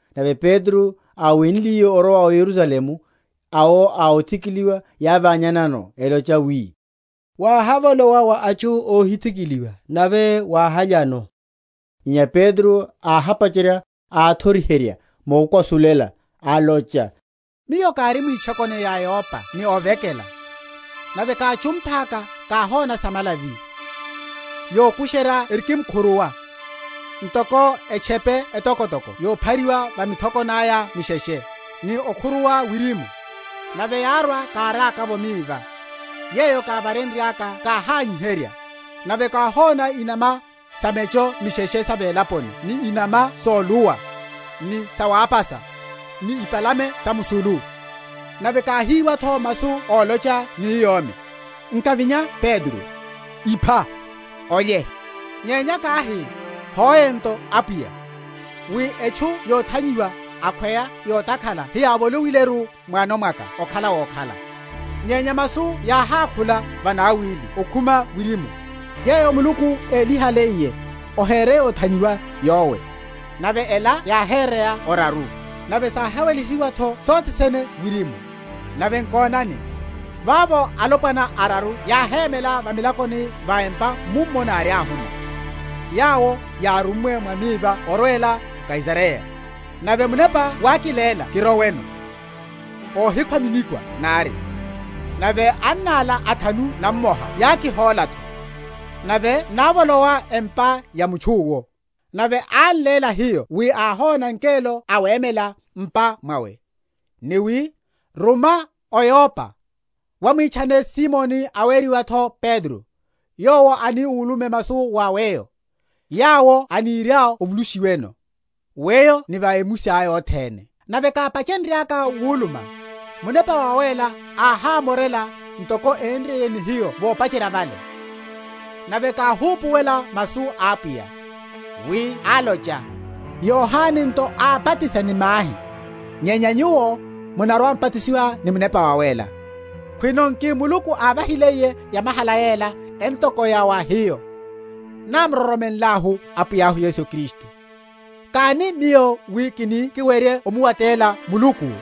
Nave Petro áwenliye orwa o Yerusalemu, awo a othikiliwa, yávanyihanano, elocha wi, Wáhavolowa wa atchu óhithikiliwa, nave wáhalyano. Nyenya Petro áhapacherya, áthoriherya mokwasulela, alocha, Miyo kári mwitchokoni ya Yopa ni ovekela; nave káchumphaka káhona samalavi, yokusherya erikimkhuruwa, ntoko etchepe etokotoko yophariwa va mithokoni aya misheshe; ni okhuruwa wirimu, nave yárwa káriaka’vo miva: yeyo kávareryaka káhányiherya, nave káhóna inama sa mecho misheshe sa velaponi ni inama soluwa, ni sawápasa, ni ipalame samusulu. Nave káhíwa’tho masu ólocha ni yomi, Nkavinya Petro, ipha, olye. Nyenya káhi, Hoe nto, Apwiya; wi etchu yothanyiwa, akhweya yotakhala heyávoloiyeru m’wano mwaka okhala wokhala. Nyenya masu yáhákhula vanawili ókhuma wirimu, Yeyo Muluku élihaliye, ohere yothanyiwa yowe. Nave ela yáhéreya oraru; nave sáhawelihiwa’tho sothe sene wirimu. Nave nkonani, vavo alopwana araru yáhémela va milakoni va’mpa mummo náriahumo, yawo yárummwe wa miva orwela o Kaisareya. Nave Munepa wákiléla kiroweno, óhikhwa minikwa nari. Nave anna ala athanu nammoha yákihóla’tho; nave návolowa empa ya mutchu’wo: nave án’léla hiyo wi áhona ngelo awemela m’pa mwawe, ni wi, Ruma o Yopa, wahimwítchane Simoni, aweriwa’tho Petro; yowo ani ulume masu wa weyo, yawo oniriá ovulushiweno, weyo ni avemusiá othene. Nave kápachenryaka wuluma, Munepa Wawéla áhámorela, ntoko énriye ni hiyo vopacherya vale. Nave káhupuwela masu a Apwiya, wi álocha, Yohane nto ábatisa ni mahi; nyenya nyuwo munarwa‐m’batisiwa ni Munepa Wawéla. Khwino nki Muluku ávahiliye yamahala yela entoko ya wa hiyo, námuroromenlahu Apwiya Yesu Kristu, káni miyo wi kini kiwerye omuwatela Muluku?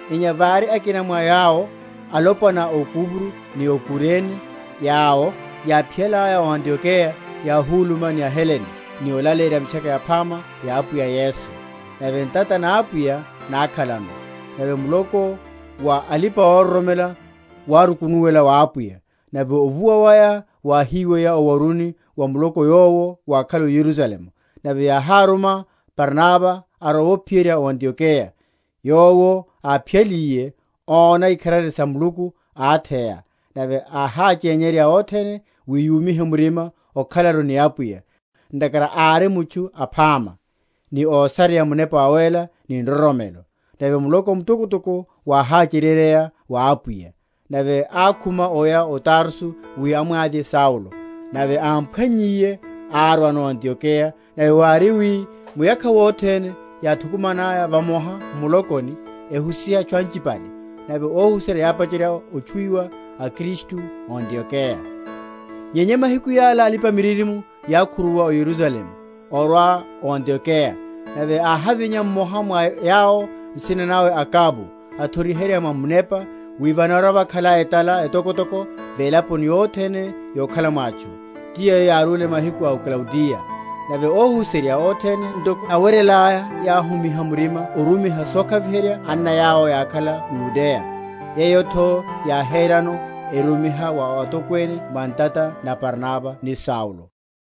Nyenya vári akina mwa yawo alopwana ó Kupro, ni Kurene, yawo, yáphiyalaya o Antiokeya, yáhuluma ni aHelene, ni olaleyerya Mitchaka Yaphama ya Apwiya Yesu. Nave ntata na Apwiya nákhalano; nave muloko wa alipa‐ororomela wárukunuwela wa Apwiya. Nave ovuwa waya wáhiweya o’waruni wa muloko yowo wákhala o Yerusalemu; nave yáhamuruma Barnaba arowe ophiyerya o Antiokeya; yowo, áphiyaliye, óna ikharari sa Muluku, átheya; nave áháchenyerya othene, wi yúmihe murima okhalaru ni Apwiya; ntakhara ári mutchu aphama, ni ósareya Munepa Wawéla ni nroromelo: nave muloko mtokotoko wáháchereryeya wa Apwiya. Nave ákhuma oya o Tarso wi amwavye Saulo: nave ámphwannyiye, árwano o Antiokeya. Nave wári, wi muyakha wothene yáthukumana vamoha m’mulokoni, ehusiha atchu anchiene; nave óhuserya yápacherya ótchuwiwa aKristu o Antiokeya. Nyenya mahiku yala alipa‐miririmo yákhuruwa o Yerusalemu orwa o Antiokeya. Nave áhavinya mmoha mwa yawo, nsina nawe Agabo, athoriherya mwa Munepa, wi vanarwa‐vakhala etala etokotoko velaponi yothene yokhala’mo atchu; ti yeyo yárúle mahiku a Klaudiya. Nave óhuserya, othene ntoko yáweryelaya, yáhúmiha murima orumiha sokhaviherya anna yawo yákhala m’Yudeya; yeyo’tho yáherano, erumiha wa atokwene mwa ntata na Barnaba ni Saulo.